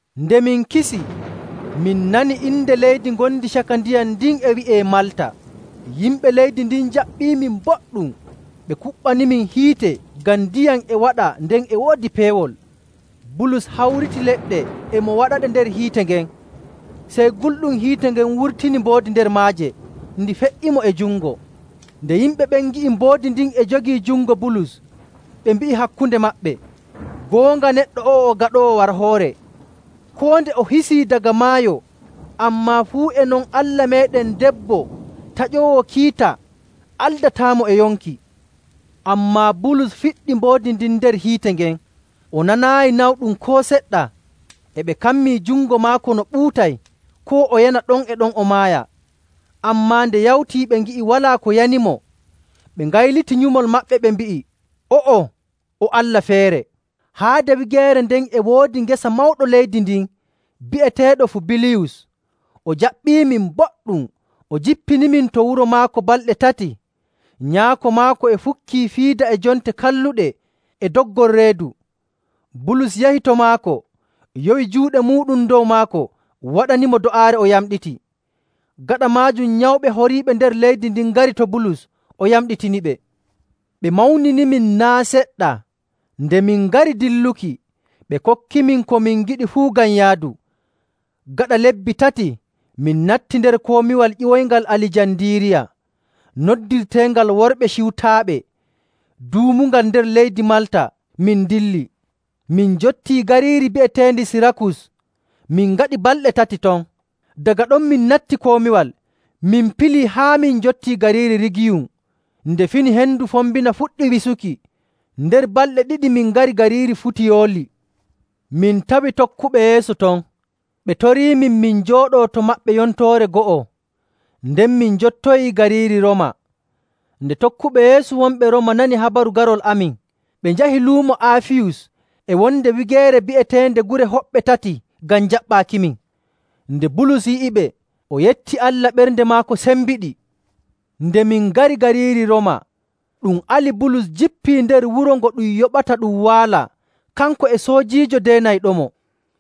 Nde min kisi, min nani inde leydi ngondi caka ndiyam ndin e wi'ee Malta. Yimɓe leydi ndin njaɓɓiimin boɗɗum. Ɓe kuɓɓanimin hiite, ngam ndiyam e waɗa, nden e woodi peewol. Bulus hawriti leɗɗe e mo waɗaɗe nder hiite ngen, sey gulɗum hiite ngen wurtini mboodi nder maaje, ndi fe''imo e jungo. Nde yimɓe ɓen ngi'i mboodi ndin e jogii jungo Bulus, ɓe mbi'i hakkunde maɓɓe, “Goonga neɗɗo o'o o gaɗoowo warhoore. Koo nde o hisii daga maayo, ammaa fuu e non allah meeɗen debbo taƴoowo kiita aldataamo e yonki.” Ammaa Bulus fiɗɗi mboodi ndin nder hiite ngen, o nanaayi nawɗum koo seɗɗa. E ɓe kammii jungo maako no ɓuutay, koo o yana ɗon e ɗon o maaya. Ammaa nde yawtii ɓe ngi'i walaa ko yanimo, ɓe ngayliti nyumol maɓɓe, ɓe mbi'i, “O'o, o allah feere!” Haade wigeere nden e woodi gese mawɗo leydi ndin, bi'eteeɗo Fubiliyus. O jaɓɓiimin boɗɗum, o jippinimin to wuro maako balɗe tati. Nyaako maako e fukkii fiida e jonte kalluɗe e doggol reedu. Bulus yahi to maako, yowi juuɗe muuɗum dow maako, waɗanimo do'aare, o yamɗiti. Gaɗa maajum, nyawɓe horiiɓe nder leydi ndin ngari to Bulus, o yamɗitiniɓe. Ɓe mawninimin naa' seɗɗa. Nde min ngari dilluki, ɓe kokkimin ko min ngiɗi fuu ngam yaadu. Gaɗa lebbi tati, min natti nder komiwal ƴiwoyngal Alijandiiriya noddirteengal Worɓe Ciwtaaɓe duumungal nder leydi Malta, min ndilli. Min njottii gariiri bi'eteendi Sirakus, min ngaɗi balɗe tati ton. Daga ɗon min natti komiwal, min pilii haa min njottii gariiri Rigiyum. Nde fini hendu fombina fuɗɗi wisuki. Nder balɗe ɗiɗi min ngari gariiri Futiyooli. Min tawi tokkuɓe Yeesu ton. Ɓe toriimin min njooɗoo to maɓɓe yontoore go'o. Nden min njottoyii gariiri Rooma. Nde tokkuɓe Yeesu wonɓe Rooma nani habaru garol amin, ɓe njahi Luumo Aafiyus e wonde wigeere bi'eteende Gure Hoɓɓe Tati ngam jaɓɓaakimin. Nde Bulus yi'iɓe, o yetti Allah, ɓernde maako sembiɗi. Nde min ngari gariiri Rooma, ɗum ali Bulus jippii nder wuro ngo ɗum yoɓata ɗum waala, kanko e soojiijo deenayɗomo.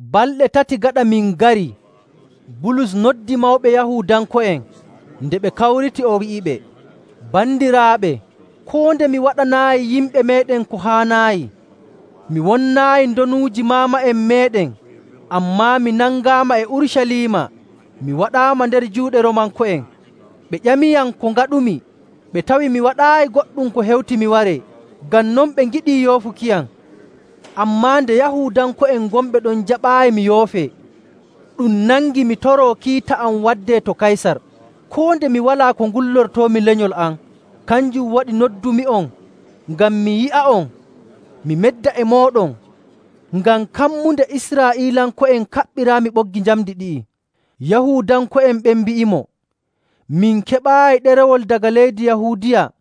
Balɗe tati gaɗa min ngarii, Bulus noddi mawɓe Yahuudanko'en. Nde ɓe kawriti, o wi'iɓe, “Bandiraaɓe! Koo nde mi waɗanaayi yimɓe meeɗen ko haanaayi, mi wonnaayi ndonuuji maama'en meeɗen, ammaa mi nangaama e Urucaliima, mi waɗaama nder juuɗe Roomanko'en. Ɓe ƴamiyam ko ngaɗumi. Ɓe tawii mi waɗaayi goɗɗum ko hewti mi waree, ngam non ɓe ngiɗi yoofukiyam. Ammaa nde Yahuudanko'en gonɓe ɗon njaɓaayi mi yoofee, ɗum nangi mi toroo kiita am waddee to Kaysar, koo nde mi walaa ko ngullortoomi lenyol am.. Kanjum waɗi noddumi'on ngam mi yi'a'on, mi medda e mooɗon. Ngam kammunde Israa'iilanko'en kaɓɓiraami ɓoggi njamndi ɗi'i.” Yahuudanko'en ɓen mbi'imo, “Min keɓaayi ɗerewol daga leydi Yahuudiya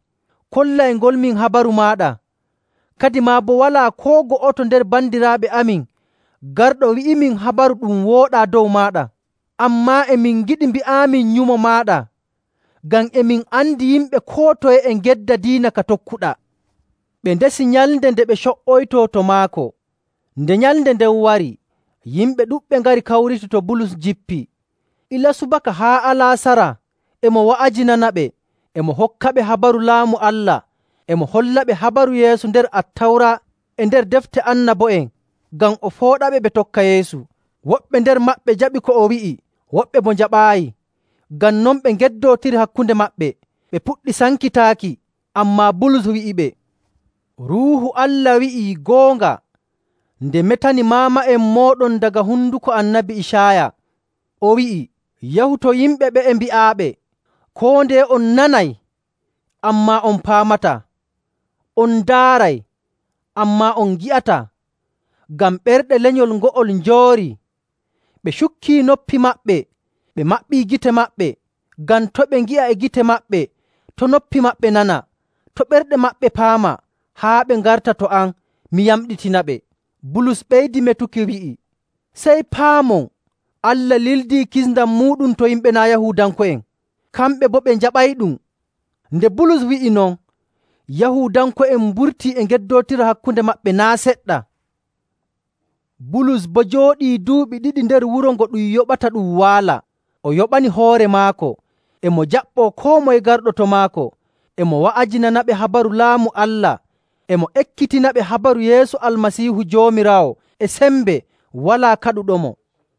kollayngolmin habaru maaɗa. Kadimaa boo walaa koo go'oto nder bandiraaɓe amin garɗo wi'imin habaru ɗum wooɗaa dow maaɗa. Ammaa e min ngiɗi mbi'aamin nyumo maaɗa, ngam e min andi yimɓe koo toye e ngedda diina ka tokkuɗaa.” Ɓe ndesi nyalnde nde ɓe co''oytoo to maako. Nde nyalnde nden wari, yimɓe ɗuɗɓe ngari, kawriti to Bulus jippii. Ilaa subaka haa alaasara e mo wa'ajinanaɓe, e mo hokkaɓe habaru Laamu Allah. E mo hollaɓe habaru Yeesu nder Attawra e nder defte annabo'en ngam o fooɗaɓe ɓe tokka Yeesu. Woɓɓe nder maɓɓe njaɓi ko o wi'i, woɓɓe boo njaɓaayi. Ngam non ɓe ngeddootiri hakkunde maɓɓe, ɓe puɗɗi sankitaaki. Ammaa Bulus wi'iɓe, “Ruuhu Allah wi'ii goonga nde metani maama'en mooɗon daga honduko Annabi Icaaya, o wi'i, ‘Yahu to yimɓe ɓe'e mbi'aaɓe: Koo ndeye on nanay, ammaa on paamataa. On ndaaray, ammaa on ngi'ataa. Ngam ɓerɗe lenyol ngo'ol njoorii. Ɓe cukkii noppi maɓɓe, ɓe maɓɓii gite maɓɓe, ngam to' ɓe ngi'a e gite maɓɓe, to' noppi maɓɓe nana, to' ɓerɗe maɓɓe paama, haa ɓe ngarta to am, mi yamɗitinaɓe.’”. Bulus ɓeydi metuki, wi'i, “Sey paamon, Allah lildii kisndam muuɗum to yimɓe naa' Yahuudanko'en. Kamɓe boo ɓe njaɓayɗum!” [Nde Bulus wi'i non, Yahuudanko'en mburtii e ngeddootira hakkunde maɓɓe naa' seɗɗa.] Bulus boo jooɗii duuɓi ɗiɗi nder wuro ngo ɗum yoɓata ɗum waala. O yoɓani hoore maako. E mo jaɓɓoo koo moye garɗo to maako, e mo wa'ajinanaɓe habaru Laamu Allah, e mo ekkitinaɓe habaru Yeesu Almasiihu Joomiraawo e sembe, walaa kaɗuɗomo.